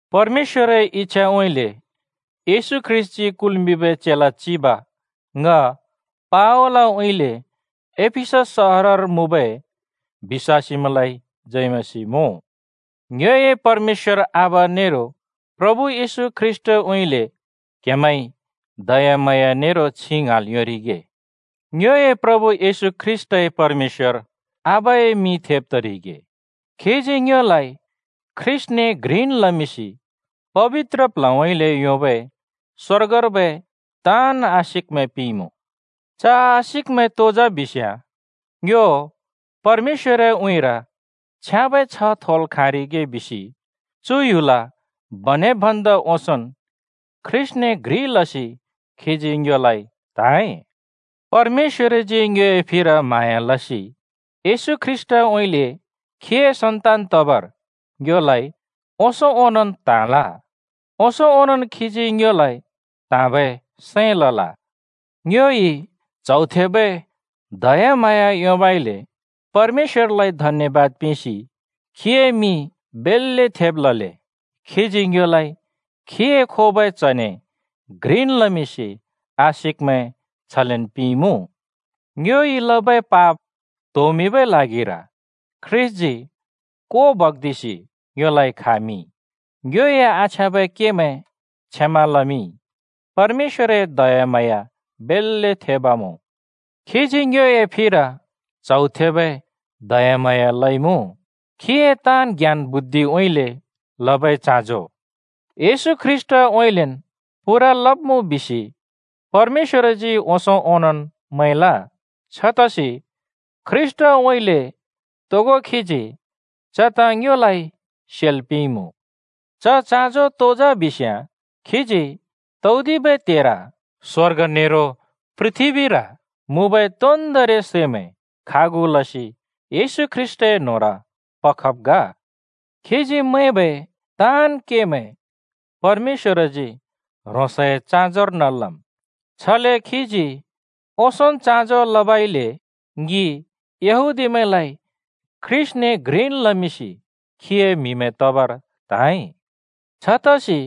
परमेश्‍वरए इच्‍छाउँइँले येशू ख्रीष्‍टजी कुल्मिंबै चेला चिब ङ पावलउँइँले एफिसस सहरर मुँबै बिश्‍वासीमैंलाइ जय मसीह मुँ। ङ्योए परमेश्‍वर आबा नेरो प्रभु येशू ख्रीष्‍टउँइँले क्हेमैंइ दयाम्हाँया नेरो छिं ङ्हाँल् योंरिगे। ङ्योए प्रभु येशू ख्रीष्‍टए परमेश्‍वर नेरो आबाए मिं थेब् तरिगे! खीजी ङ्योलाइ ख्रीष्‍टने घ्रिन् लमिंसि पबित्र प्ल्हउँइँले योंबै स्वर्गर्बै ताँन् आशिकमैं पिंइमुँ। च आशिकमैं तो जा बिस्‍याँ, ङ्यो परमेश्‍वरए उँइँर छ्याँबै छ्ह थोल् खाँरिगे बिसि चु ह्‍युल बनेब् भन्दा ओंसोंन् ख्रीष्‍टने घ्रिन् लसि खीजी ङ्योलाइ त्‍हाँइ। परमेश्‍वरजी ङ्योए फिर म्हाँया लसि येशू ख्रीष्‍टउँइँले खीए सन्तान तबर ङ्योलाइ ओंसों ओनोंन् त्‍हाँल। ओंसों ओंनोंन् खीजी ङ्योलाइ त्हाँबै सैं लल। ङ्योइ च्हौ थेबै दयाम्हाँया योंबइले परमेश्‍वरएलाइ धन्यबाद पिंसि खीए मिं बेल्‍ले थेब् लले। खीजी ङ्योलाइ खीए खोबै च्‍हने घ्रिन् लमिंसि आशिकमैं छलेन् पिंइमुँ। ङ्योइ लबै पाप त्होमिंबै ल्हागिर ख्रीष्‍टजी को बग्दिसि ङ्योलाइ खामिंइ, ङ्योए आछ्याँबै केमैं क्षमा लमिंइ। परमेश्‍वरए दयाम्हाँया बेल्‍ले थेब् मुँ! खीजी ङ्योए फिर च्हौ थेबै दयाम्हाँया लइमुँ। खीए ताँन् ज्ञान बुद्धिउँइँले लबै चाँजो येशू ख्रीष्‍टउँइँलेन् पूरा लब्‍मुँ बिसि परमेश्‍वरजी ओंसों ओंनोंन् मैंल। छतसि ख्रीष्‍टउँइँले तोगो खीजी च ताँ ङ्योलाइ सेल् पिंइमुँ। च चाँजो तो जा बिस्‍याँ: खीजी तौदिबै त्हेर स्‍वर्ग नेरो पृथ्‍बीर मुँबै तोन्दोंरि सैमैं खागु लसि येशू ख्रीष्‍टए न्होंर पखब् ग। खीजी मैंबै ताँन् केमैं परमेश्‍वरजी ह्रोंसए चाँजोर्न लम्। छले खीजी ओंसोंन् चाँजो लबइले ङि यहूदीमैंलाइ ख्रीष्‍टने घ्रिन् लमिंसि खीए म्‍हिमैं तबर त्हाँइ। छतसि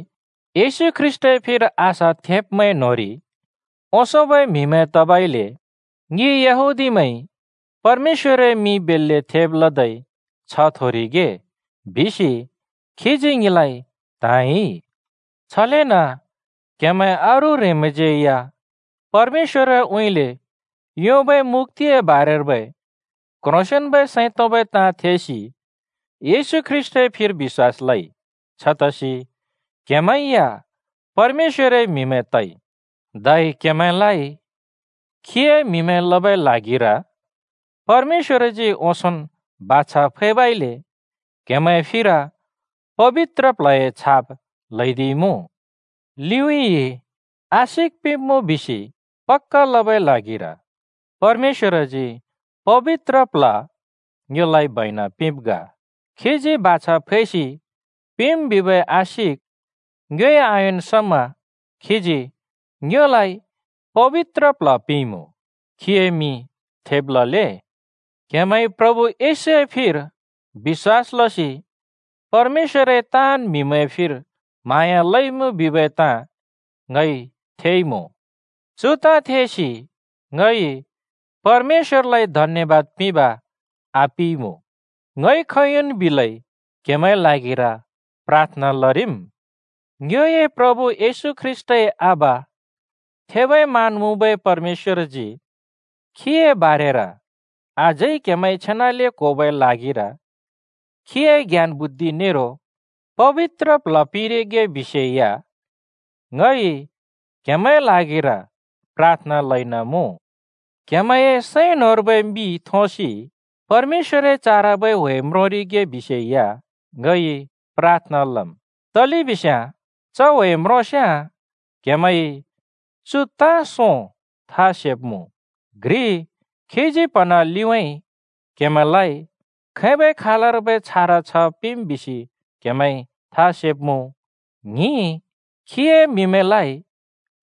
ख्रीष्‍टए फिर आशा थेंब्‍मैं न्‍होंरि ओंसोंबै म्‍हिमैं तबइले ङि यहूदीमैंइ “परमेश्‍वरए मिं बेल्‍ले थेब् लदै छ्ह थोरिगे!” बिसि खीजी ङिलाइ त्हाँइ। छलेन क्‍हेमैं अरू ह्रेंमैंज्यै या परमेश्‍वरउँइँले योंबै मुक्‍तिए बारर्बै क्ह्रोंसेंन्बै सैं तोंबै ताँ थेसि येशू ख्रीष्‍टए फिर बिश्‍वास लइ। छतसि क्‍हेमैं या परमेश्‍वरए म्‍हिमैं तइ, धै क्‍हेमैंलाइ खीए म्हिमैं लबै ल्हागिर परमेश्‍वरजी ओंसोंन् बाछा फैबइले क्हेमैंए फिर पबित्र प्ल्हए छाप ल्हैदिइमुँ। लिउँइँ आशिक पिब्मुँ बिसि पक्‍का लबै ल्हागिर परमेश्‍वरजी पबित्र प्ल्ह ङ्योलाइ बैना पिंब् ग। खीजी बाछा फैसि पिंम् बिबै आशिक ङ्योइ आयोंन् समा खीजी ङ्योलाइ पबित्र प्ल्ह पिंइमुँ। खीए मिं थेब लले! क्‍हेमैंइ प्रभु येशूए फिर बिश्‍वास लसि परमेश्‍वरए ताँन् म्‍हिमैंए फिर म्हाँया लइमुँ बिबै ताँ ङइ थेइमुँ। चु ताँ थेसि ङइ परमेश्‍वरलाइ धन्‍यबाद पिंब आपिइमुँ। ङइ खोंयोंन् बिलै क्‍हेमैंए ल्हागिर प्राथना लरिम्। ङ्योए प्रभु येशू ख्रीष्‍टए आबा थेबै मान मुँबै परमेश्‍वरजी खीए बारेर अझै क्‍हेमैंइ छेनाले क्होबै ल्हागिर खीए ज्ञान बुद्धि नेरो पबित्र प्ल्ह पिंरिगे बिसे या ङइ क्हेमैंए ल्हागिर प्राथना लइन मुँ। क्‍हेमैंए सैं न्‍होंर्बै मि थोंसि परमेश्‍वरए चारबै ह्‍वे म्रोंरिगे बिसे या ङइ प्राथना लम्। तलेबिस्‍याँ च ह्‍वे म्रोंस्‍याँ क्‍हेमैंइ चु ताँ सों था सेब्‍मुँ: घ्रि, खीजी प्‍हना लिउँइँ क्‍हेमैंलाइ खैबै खालर्बै छार छ्ह पिंम् बिसि क्‍हेमैंइ था सेब्‍मुँ। ङ्हिं, खीए म्‍हिमैंलाइ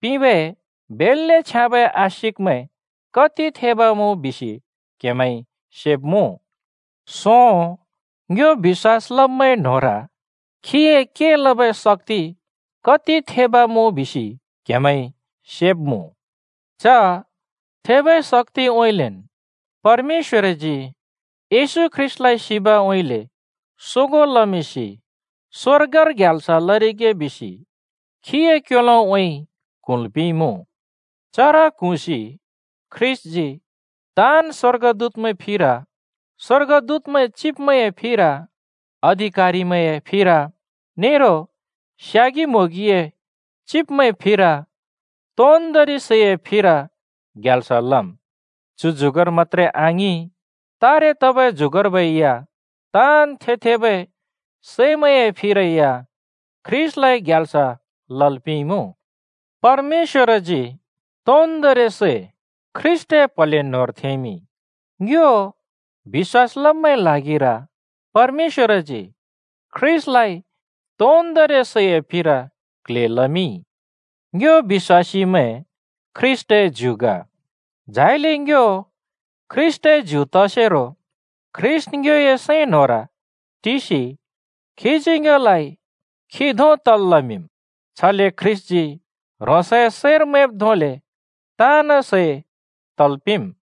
पिंबै बेल्‍ले छ्याँबै आशिकमैं कति थेब मुँ बिसि क्‍हेमैंइ सेब्‍मुँ। सों, ङ्यो बिश्‍वास लब्मैंए न्होंर खीए के लबै शक्‍ति कति थेब मुँ बिसि क्‍हेमैंइ सेब्मुँ। च थेबै शक्‍तिउँइँलेन् परमेश्‍वरजी येशू ख्रीष्‍टलाइ सिबउँइँले सोगों लमिंसि स्वर्गर ग्याल्स लरिगे बिसि खीए क्‍योलोउँइँ क्हुँल् पिंइमुँ। चर क्हुँसि ख्रीष्‍टजी ताँन् स्‍वर्गदूतमैंए फिर, स्‍वर्गदूतमैंए चिब्मैंए फिर, अधिकारिमैंए फिर नेरो स्‍यागि-म्‍होंगिमैंए चिब्मैंए फिर, तोन्‍दोंरि सैए फिर ग्याल्स लम्। चु जुगर मत्‍त्रे आङिं, तारे तबै जुगर्बै या ताँन् थे-थेबै सैमैंए फिर ख्रीष्‍टलाइ ग्याल्स लल् पिंइमुँ। परमेश्‍वरजी तोन्दोंरि सै ख्रीष्‍टए प्‍हले न्‍होंर थेंमिंइ। ङ्यो बिश्‍वास लब्मैंए ल्हागिर परमेश्‍वरजी ख्रीष्‍टलाइ तोन्दोंरि सैए फिर क्ल्हे लमिंइ। ङ्यो बिश्‍वासीमैं ख्रीष्‍टए ज्यु ग। झाइले ङ्यो ख्रीष्‍टए ज्यु तसेरो ख्रीष्‍ट ङ्योए सैं न्‍होंर टिसि खीजी ङ्योलाइ खी धों तल् लमिंम्। छले ख्रीष्‍टजी ह्रोंसए सैंर मैंब् धोंले ताँन् सै तल् पिंम्।